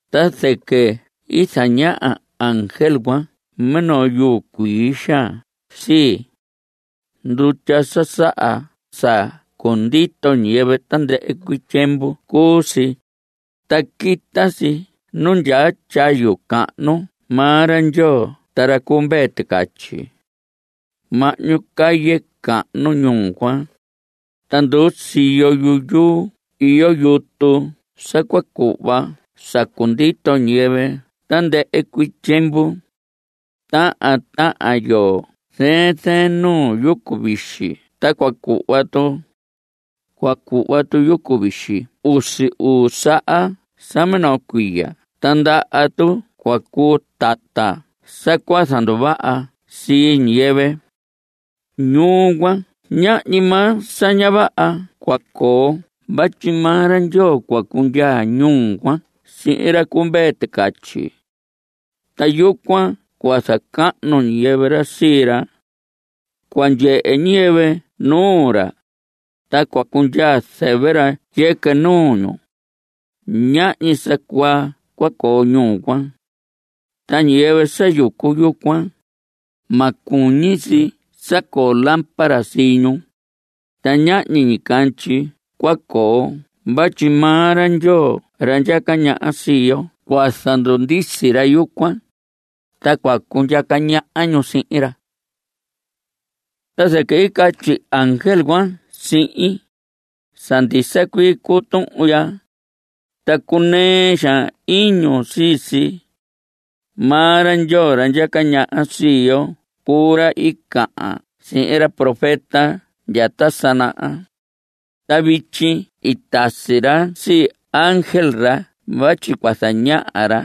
Ta zɨquɨ i zañaha ángel cuan minoo yuu cuii xaan sii. Ndutya sa saha sa cundito ñiyɨvɨ tandɨhɨ cuii tyiemvu cuu si, ta quita si nu ndyaa tyayu cahnu maa ra Ndyoo ta ra cu Mvee Ticatyi. Mahñu calle cahnu ñuu cuan, ta nduu siyo yu yuu iyo yutu sa cua cuhva sa cundito ñiyɨvɨ tandɨhɨ cuii tyiemvu. Tahan tahan yoo zɨɨn zɨɨn nuu yucu vixi cua cuhva tu. Cua cuhva tu yucu vixi usi uu saha sa minoo cuiya. Ta ndaha tu cua cuu tata sa cua zanduvaha sii ñiyɨvɨ. Ñuu cuan, ñahñi maa sa ña vaha cua coo vatyi maa ra Ndyoo cua cundyaa ñuu cuan sihin ra cu Mvee Ticatyi. Ta yucuan cua zacahnu ñiyɨvɨ ra sii ra. Cua ndyehe ñiyɨvɨ nuu ra, ta cua cundyaa zɨvɨ ra yɨquɨ nuu ñu. Ñahñi sa cuaa cua coo ñuu cuan. Ta ñiyɨvɨ sa yucu yucuan, ma cuñi si sa coo lámpara sii ñu, ta ñahñi ñicandyi cua coo vatyi maa ra Ndyoo ra ndyaca ñaha sii yo cua zandundisi ra yucuan, ta cua cundyaca ñaha ñu sihin ra. Ta zɨquɨ i catyi ángel cuan sihin: Sa ndisa cuii cuu tuhun ya, ta cunɨɨ xaan iñun sii si. Maa ra Ndyoo ra ndyaca ñaha sii yo cuu ra i cahan sihin ra profeta ta sa naha. Ta vityi i tasi ra sii ángel ra vatyi cua zañaha ra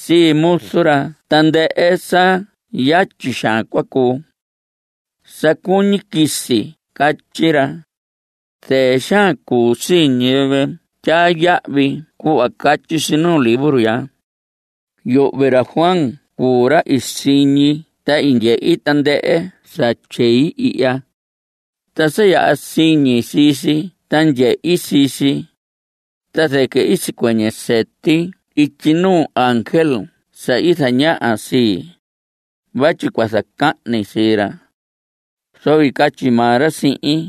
sii muzu ra tandɨhɨ sa yatyi xaan cua cuu. ¡Sa cuñi quisi! Catyi ra. Zɨɨ xaan cuu sii ñiyɨvɨ tyaa yahvi cuhva catyi si nuu libro ya. Yuhvi ra Juan cuu ra i siñi ta i ndyehi tandɨhɨ sa tyei ihya. Ta sa yaha siñi sii si ta ndyehi sii si, ta zɨquɨ i sicuɨñɨ sɨti ityi nuu ángel sa i zañaha sii, vatyi cua zacahni sii ra. Zoco i catyi maa ra sihin: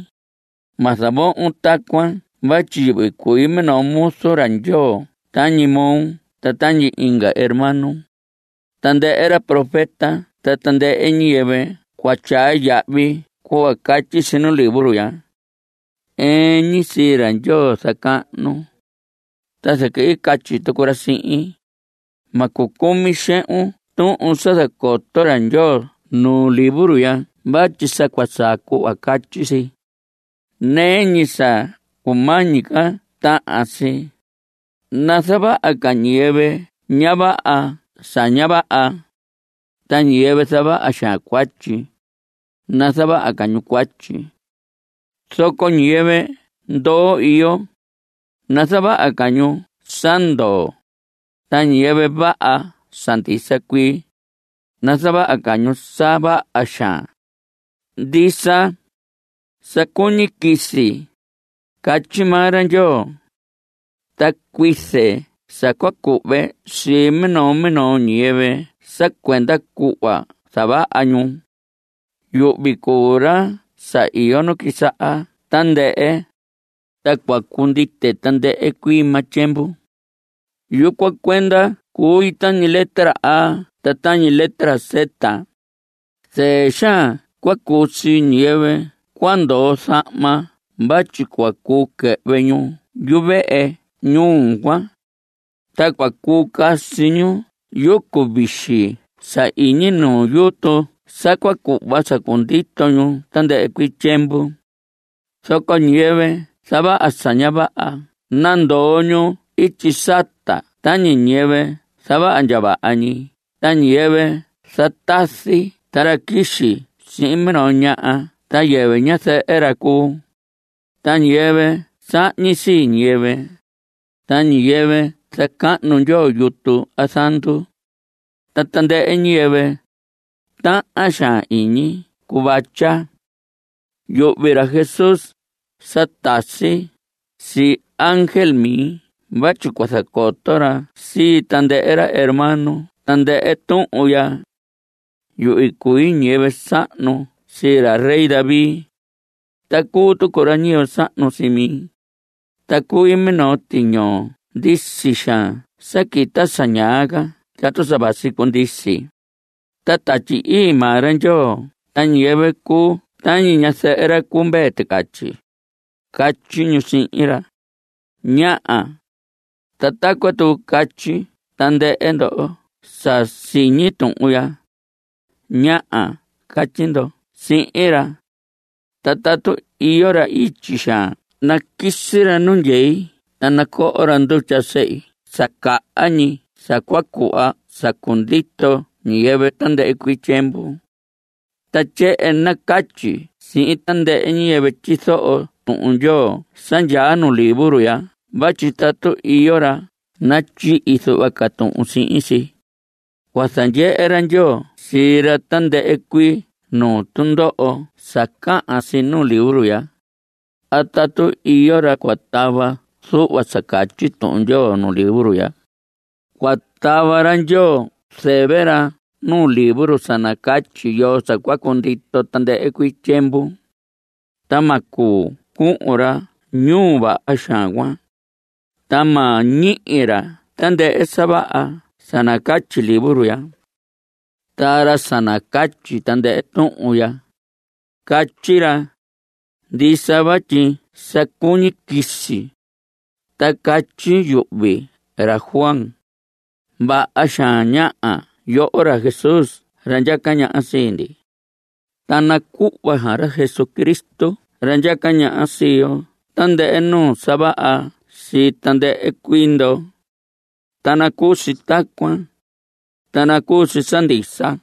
Ma zavohon tacuan vatyi yuhvi cui minoo muzu ra Ndyoo tañi moo ta tañi inga hermanos, tandɨhɨ ra profeta ta tandɨhɨ ñiyɨvɨ cua tyaa yahvi cuhva catyi si nuu libro ya. Ɨɨn ñi sii ra Ndyoo zacahnun. Ta zɨquɨ i catyi tucu ra sihin: Ma cucumi xehun tuhun sa zacoto ra Ndyoo nuu libro ya vatyi sa cua saa cuhva catyi si. Nɨɨ ñi sa cumañi ca tahan si, nazavaha ca ñiyɨvɨ ña vaha sa ña vaha, ta ñiyɨvɨ zavaha xaan cuatyi, nazavaha ca ñu cuatyi. Zoco ñiyɨvɨ ndoo iyo, nazavaha ca ñu sa ndoo, ta ñiyɨvɨ vaha sa ndisa cuii, nazavaha ca ñu sa vaha xaan. Ndisa, sa cuñi quisi, catyi maa ra Ndyoo. Ta cuize sa cua cuhve sii sa minoo minoo ñiyɨvɨ sa cuenda cuhva i zavaha ñu. Yuhvi cuu ra sa iyo nu quisaha tandɨhɨ, ta cua cundite tandɨhɨ cuii maa tyiemvu. Yucuan cuenda cui tañi letra A ta tañi letra Z. Zɨɨ xaan cua cuu sii ñiyɨvɨ cua ndoo zahma vatyi cua cuu quɨhvɨ ñu yuvehe ñuu cuan, ta cua cuu casi ñu yucu vixi sa iñi nu yutu sa cua cuhva sa cundito ñu tandɨhɨ cuii tyiemvu. Zoco ñiyɨvɨ zavaha sa ña vaha cua nandoo ñu ityi sata tañi ñiyɨvɨ zavaha ndya vaha ñi ta ñiyɨvɨ zatazi ta ra quixi sihin minoo ñaha sa yɨvɨ ñazɨhɨ ra cuu, ta ñiyɨvɨ sahñi sii ñiyɨvɨ, ta ñiyɨvɨ zacahnu ndyoo yutu a zandu, ta tandɨhɨ ñiyɨvɨ tahan xaan iñi cuvatya. Yuhvi ra Jesús sa tasi sii ángel mi vatyi cua zacoto ra sii tandɨhɨ ra hermano tandɨhɨ tuhun ya. Yuhvi cui ñiyɨvɨ sahnu sii ra rey David, ta cuu tucu ra ñiyɨvɨ sahnu sii mi. Ta cui minoo tiñoo ndisi xaan sa quita sa ñaa ca tatu sa vasi cundisi. Ta Tatyi Ii maa ra Ndyoo ta ñiyɨvɨ cuu tañi ñazɨhɨ ra cu Mvee Ticatyi, catyi ñu sihin ra: ¡Ñaha! Ta tacuan tucu catyi tandɨhɨ ndo sa siñi tuhun ya. ¡Ñaha! catyi ndo sihin ra. Ta tatu iyo ra ityi xaan naquisi ra nu ndyei ta nacoho ra ndutya sehi sa caha ñi sa cua cuhva sa cundito ñiyɨvɨ tandɨhɨ cuii tyiemvu. Ta tyehen nacatyi sihin tandɨhɨ ñiyɨvɨ tyizoho Tuhun Ndyoo sa ndyaa nu libro ya vatyi tatu iyo ra natyihi zuhva ca tuhun sihin si, cua zandyehe ra Ndyoo sii ra tandɨhɨ cuii nuu tundoho sa cahan si nuu libro ya. A tatu iyo ra cua tava zuhva sa catyi Tuhun Ndyoo nuu libro ya, cua tava ra Ndyoo zɨvɨ ra nuu libro sa nacatyi yoo sa cua cundito tandɨhɨ cuii tyiemvu, ta ma cuu cuhun ra ñuu vaha xaan cuan, ta ma ñihi ra tandɨhɨ sa vaha sa nacatyi libro ya. Ta ra sa nacatyi tandɨhɨ tuhun ya, catyi ra: Ndisa vatyi sa cuñi quisi. Ta catyi yuhvi ra Juan: Vaha xaan. ¡Ñaha! yoho ra Jesús ra ndyaca ñaha sii ndi! Ta nacuhva xaan ra Jesucristo ra ndyaca ñaha sii yo tandɨhɨ nuu sa vaha sii tandɨhɨ cuii ndo. Ta nacuu si tacuan, ta nacuu si sa ndisa.